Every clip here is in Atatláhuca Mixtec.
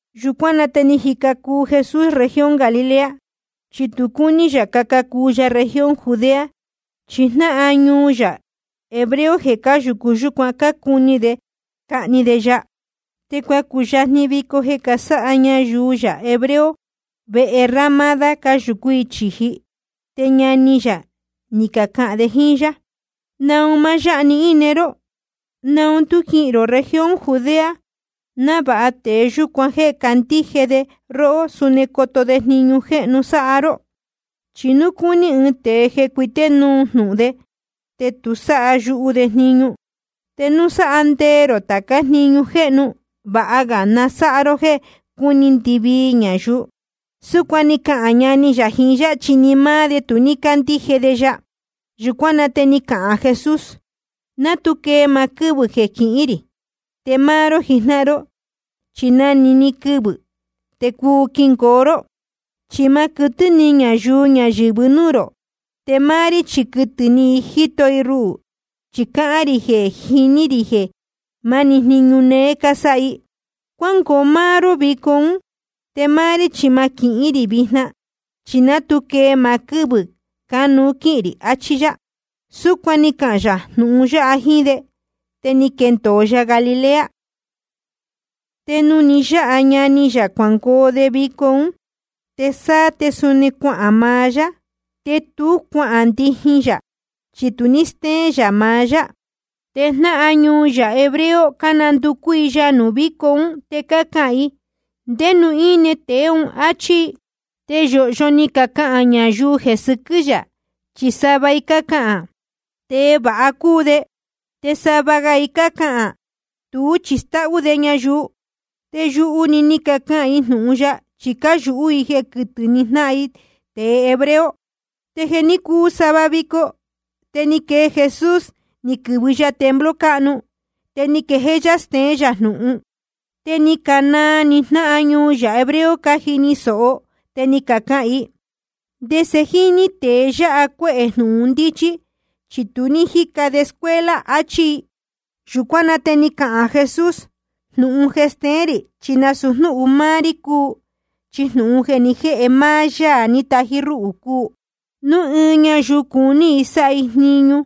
Yūcuán na te jíca cuu Jesús región Galilea. Chi tu cúní yā caca cuu ya región Judea, chi jnáhan ñuu yā hebreo jeē cáyūcu yúcuan, cácuni de cahni de ya. Te cuacuyajni vico jeē casáha ñayuu yā hebreo vehe ramádá, cáyūcú i chīji. Te ñani yā ni cacahān de jíín yá: ¿Naun máá yáha‑ni íne ró? ¿Naun tú quihīn rō región Judea, návāha tēe yūcuan jéē cácandíje de róhó, suni coto de jniñu jéhnu sáha ró. Chi núu cúní ɨɨn tēe jeē cuité núu jnūhun de, te tu sáha yuhu de jniñu. Te núu sáha nde ró táca jniñu jéhnu, vāha ga na sáha ró jéē cúni ndɨvii ñayuu. Súcuan ni cacahān ñani yā jiín yá, chi ni máá de tu cácandíje de ya. Yūcuán na te ni cahān Jesús: Ná tu quee maá quɨ́vɨ̄ jeē quihín rī. Te máá ró jijnáhan ró chi na‑ni quɨvɨ̄‑ni te cuu quingoo ró. Chi ma quɨtɨ́ ni ñayuu ñayɨ̄vɨ núū rō, te máá rí chi quɨ́tɨ́ ni i jíto i ruhū, chi cáhán rī jeē jiní rī jeē máni jniñu néé cásáha i. Cuángoo máá ró vico ún. Te máá rí chi ma quihín rī vijna, chi ná tu quee maá quɨ́vɨ̄ cánuú quíhīn rī. Achí yá. Súcuan ni cahān yā jnūhun yáha jíín de, te ni quendōo ya Galilea. Te nuū ni yáha ñani yā cuangoo de vico ún, te sáá te suni cuahān maá yá. Te tú cuahān ndijin yā, chi tu ní stéén yā maá yá. Te jnáhan ñuu yā hebreo cánanducú i ya nuū víco ún, te cácahān i: ¿Ndé nuū íne tēe ún? áchí i. Te yōhyo ni cacahān ñayuu jeē sɨquɨ́ yā, chi sava i cácahān: Tēe vāha cúu de. Te sava ga i cácahān: Tuú chi stáhú de ñayuu. Te yuhu‑ni ni cacahān i jnūhun ya, chi cáyūhú i jeē quɨtɨ́ ni jnáhan i tēe hebreo. Te jeē ní cuu sava vico, te ni quee Jesús, ni quɨ̄vɨ ya templo cáhnu, te ni quejéé yá steén yā jnūhun. Te ni canaa ni jnáhan ñuu yā hebreo cájini sōho i, te ni cacahān i: ¿Ndese jíní tēe yáha cuéhē jnūhun ndíchí, chi tu ní jíca de escuela? áchí i. Yūcuán na te ni cahān Jesús: Jnūhun stéén rī chi nasūu jnúhun máá rí cúu, chi jnūhun jeē ni jéhe máá Yaā ní tají rúhū cúu. Núu ɨɨn ñayuu cuní i sáha i jniñu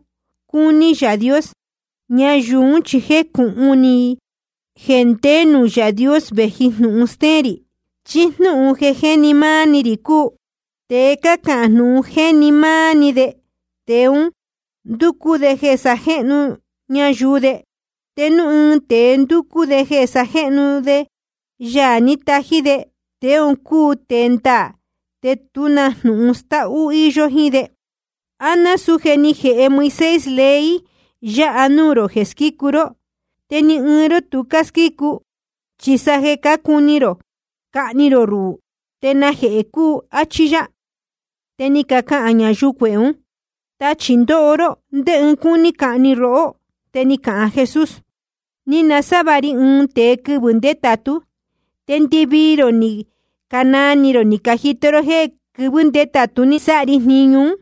cúní Yaā Dios, ñayuu ún chi jecūhun ni i núu nde nuū Yaā Dios vēji jnūhun stéén rī, chí jnúhun jeē jéni ni maá‑ni ri cúu. Tēe cáhán jnūhun jéni ni maá de, tēe un ndúcú de jeē na sájéhnu ñayuu de. Te núu ɨɨn tēe ndúcú de jeē sajéhnu de Yaā ní tají de, tēe un cúu tēe ndaā, te tú na jnūhun stáhú íyó jíín de. ’¿A násūu jéē ni jéhe Moisés ley yā nuū rō jeē squícu ró? Te ni ɨɨn ró tu cásquícu. Chi sa jeē cácuni rō cahni rō ruhū, ¿te najehē cúu? Achí yá. Te ni cacahān ñayuu cuehē ún: Tachī ndóho ró. ¿Ndé ɨɨn cúní cahni rohó? Te ni cahān Jesús: Ni nasávāha ri ɨɨn tēe quɨvɨ̄ ndétātú, te ndɨvii rō ni canaa ni rō ni cajito ró jéē quɨvɨ́ ndétātú ni sáha ri jniñu ún.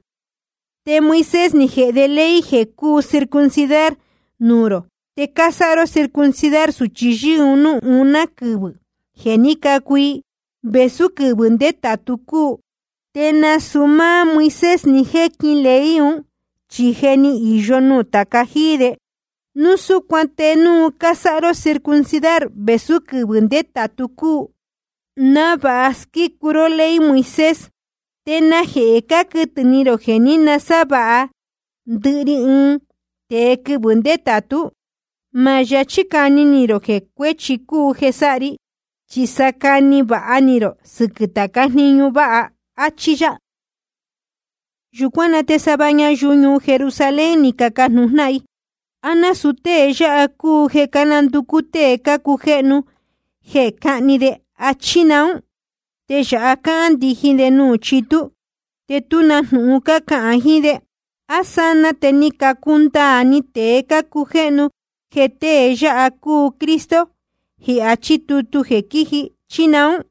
Te Moisés ni jēhe de ley jeē cúu circuncidar nuū rō. Te cásáha ró circuncidar sūchi yɨ́ɨ́ núū uná quɨvɨ̄ jeē ní cacu i, vēsú quɨvɨ̄ ndétātu cúu. (Te nasūu máá Moisés ní jéquin ley un, chi je ni īyo nuū tāca jíí de.) Núu súcuan te núu cásáha ró circuncidar vēsú quɨvɨ̄ ndétātu cúu, návāha squícu ró ley Moisés, ¿te najehē cáquɨtɨ̄ ni rō jeē ní nasávāha ndɨhɨ ri ɨɨn tēe quɨvɨ̄ ndétātú? Ma yachí cani ni rō jeē cuéchi cúu jeē sáha ri. Chi sa cani vāha ni rō sɨquɨ̄ tācá jniñu váha. Achí yá. Yūcuán na te sava ñayuu ñuu Jerusalén ni cacajnūhun jnáhan i: ¿A násūu tée yáha cúu jeē cánanducú tée cácujéhnu jeē cáhni de, chí naún? Te yāha cáhán ndijin de nuū chitú, te tú na jnūhun cácahān jiín de. ¿A sanaa te ni cacundaā ni tēe cácujéhnu jeē tée yáha cúu Cristo jeē achí tutu jeē quiji, chí naún?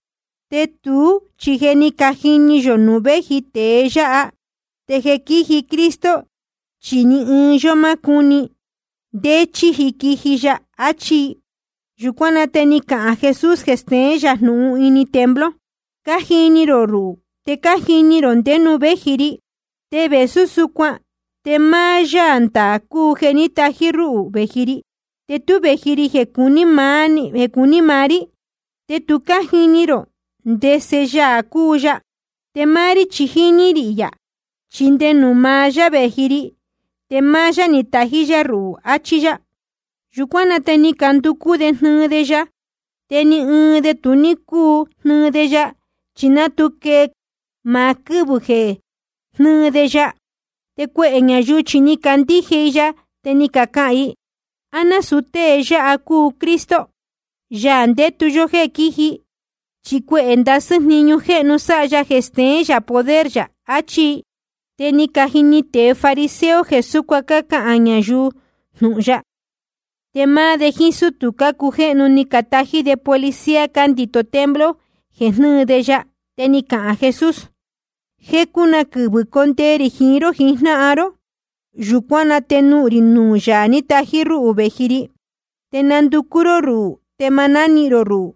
Te tuú chi je cájini yō nuū véji tēe yáha. Te jeē quíji Cristo, chi ni ɨɨn yó má cúni ndé chi quíji ya. Achí i. Yūcuán na te ni cahān jee Jesús jeē steén yā jnūhun ini templo: Cájini rō ruhū, te cájini rō ndé ñuu vēji ri. Te vēsú súcuan te máá Yaā ndaā cúu jeē ní tají rúhū vēji ri, te tú vēji ri jeē cuní maá rí. Te tu cájini rō ndese Yaā cúu ya. Te máá rí chi jíní rī yā, chi nde nuū maá yá vēji ri, te máá yá ni tají rúhū, achí yá. Yūcuán na te ni canducú de jnɨɨ de ya. Te ni ɨɨn de tu ní cúu jnɨɨ de ya, chi ná tu quee maá quɨ́vɨ̄ jeē jnɨ́ɨ de ya. Te cuehē ñayuu chi ni cacandíje i ya, te ni cacahān i: ¿A násūu tée yáha cúu Cristo, Yaā ndétu yó jéē quiji? Chi cuehē ndasɨ́ jniñu jéhnu sáha ya jeē steén yā poder yā. Achí i. Te ni cajini tēe fariseo jeē súcuan cácahān ñayuu jnūhun ya. Te máá de jíín sútū cácujéhnu, ni catají de policía cándito templo jeē jnɨ́ɨ de ya. Te ni cahān Jesús: Jecu na quɨvɨ̄ condee rī jiín ró jijnáhan ró. Yūcuán na te nuhun rī nuū Yaā ní tají rúhū vēji ri. Te nanducú ró ruhū, te ma nánihīn rō ruhū.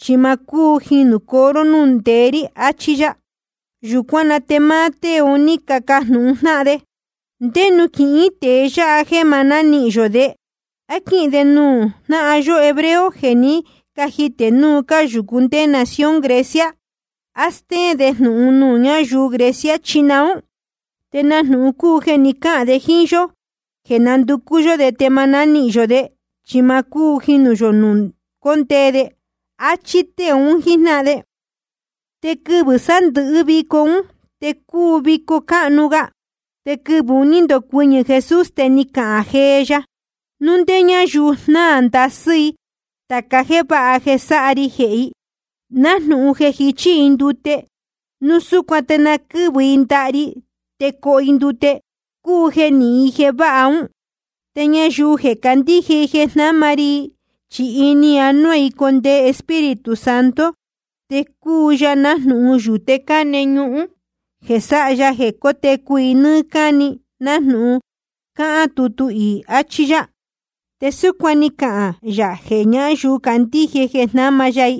Chi ma cúu jinūcoo ró núū cóndee rī. Achí yá. Yūcuán na te máá tée un ní cacajnūhun jnáhan de: ¿Te ndé nuū quihín tēe yáha jeē ma nánihīn yō de? ¿A quíhīn de nuū jnáhan yó hebreo jeē ní cajitē núu cáyūcu ndé nación Grecia? ¿Te á stéén de jnūhun nuū ñáyuu Grecia, chí naún? ¿Te na jnūhun cúu jeē ni cáhān de jíín yó jeē nanducú yó de te ma nánihīn yō de, chi ma cúu jinūcoo yó núū cóndee de? Achí tée un jíjnáhan de. Te quɨvɨ̄ sándɨ̄hɨ́ vico ún te cúu vico cáhnu ga. Te quɨvɨ̄ un ní ndocuɨñɨ̄ Jesús, te ni cahān jee ya: Núu ndé ñáyuu jnáa ndasɨ́ i tāca jéē váha jeē sáha ri jehē i, nájnūhun jeē jichí i ndute, núu súcuan te na quɨ́vɨ i ndaha ri te coho i ndute, cúu jeē nihín i jeē váha ún. Te ñayuu jeē candíje jeē jnáma ri i, chi ini anuá i condee Espíritu Santo, te cuu ya nájnūhun yūte cáne ñuhún jeē sáha ya jeē cótecu i nɨ́ɨ́ cáni, nájnūhun cáhán tutu iī. Achí yá. Te súcuan ni cahān yā jeē ñáyuu candíje jeē jnáma ya i,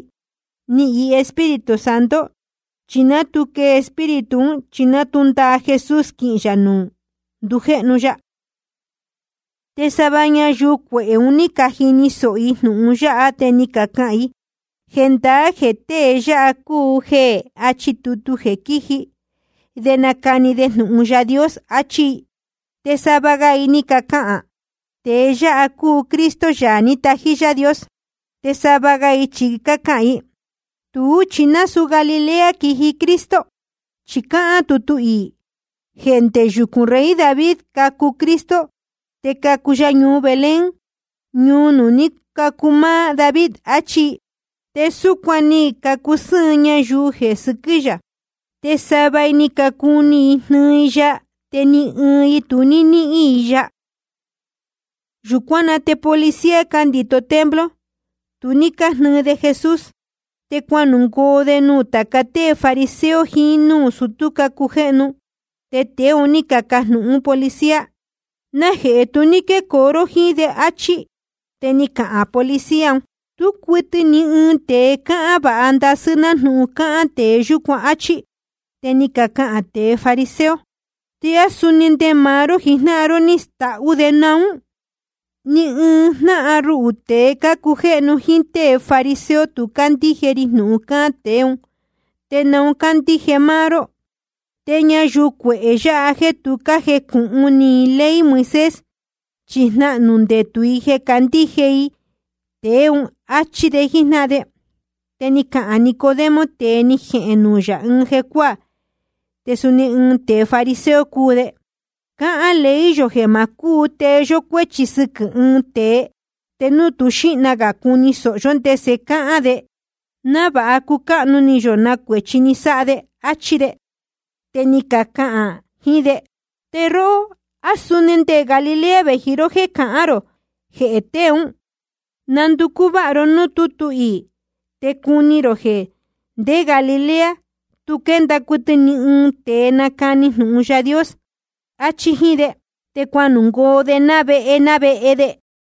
nihīn i Espíritu Santo. Chi ná tu quee Espíritu ún, chi ná tu ndaa Jesús quinuhun yā nuū ndujéhnu ya. Te sava ñayuu cuehē ún, ná ni cajini sōho i jnūhun yáha, te ni cacahān i: Jendaá jeē tée yáha cúu jeē achí tutu jeē quiji de nacani de jnūhun Yaā Dios, achí i. Te sava ga i ni cacahān: Tēe yáha cúu Cristo, Yaā ní tají Yaā Dios. Te sava ga i chi ni cacahān i: Tuú chi nasūú Galilea quiji Cristo. Chi cáhán tutu iī jeē ndé yucūn rey David cacu Cristo, te cacu ya ñuu Belén, ñuu nuū ní cacu máá David. Achí i. Te súcuan te ni cacusɨ́ɨn ñayuu jeē sɨquɨ́ yā. Te sava i cácuni i jnɨɨ i ya, te ni ɨɨn i tu ní jnɨ́ɨ i ya. Yūcuán na te policía cándito templo tu ní cájnɨɨ de Jesús, te cuanungoo de nuū tāca tée fariseo jiín núū sutú cácujéhnu. Te tēe ún ni cacajnūhún de policía: ¿Najehē tu ní quécoo ró jíín de? áchí. Te ni cacahān policía un: Tú cuɨtɨ ni ɨɨn tēe cáhán vāha ndasɨ́ nájnūhun cáhán tēe yúcuan, áchí. Te ni cacahān tēe fariseo: ¿Te á suni nde máá ró jijnáhan ró ní stáhú de naún? Ni ɨɨn jnáhan ruhū tēe cácujéhnu jíín tée fariseo, tu cácandíje ri jnūhun cáhán tēe ún, ¿te naun cácandíje máá ró? Te ñayuu cuehē yāhá jéē tu cájecūhun ni i ley Moisés, chi jnahnū ndetū i jeē cácandíje i tēe ún, áchí de jíjnáhan de. Te ni cahān Nicodemo, tēe ni jéhēn nuū yā ɨɨn jecuáā, te suni ɨɨn tēe fariseo cúu de: Cáhán ley yō jeē ma cúu tee yó cuéchi sɨquɨ̄ ɨɨn tēe, te núu tú xīhna gā cuni sōho yó ndese cáhán de, návāha cucáhnu ni yō na cuēchi ni sáha de. Achí de. Te ni cacahān jiín de: Te róhó, ¿á suni nde Galilea vēji ró jéē cahán rō jehē tēe ún? Nanducú váha ró núū tútu iī te cuni rō jeē ndé Galilea tu quénda cuɨtɨ ni ɨɨn tēe nácani jnūhun Yaā Dios. Achí jíín de. Te cuanungoo de ná vehe ná vehe de.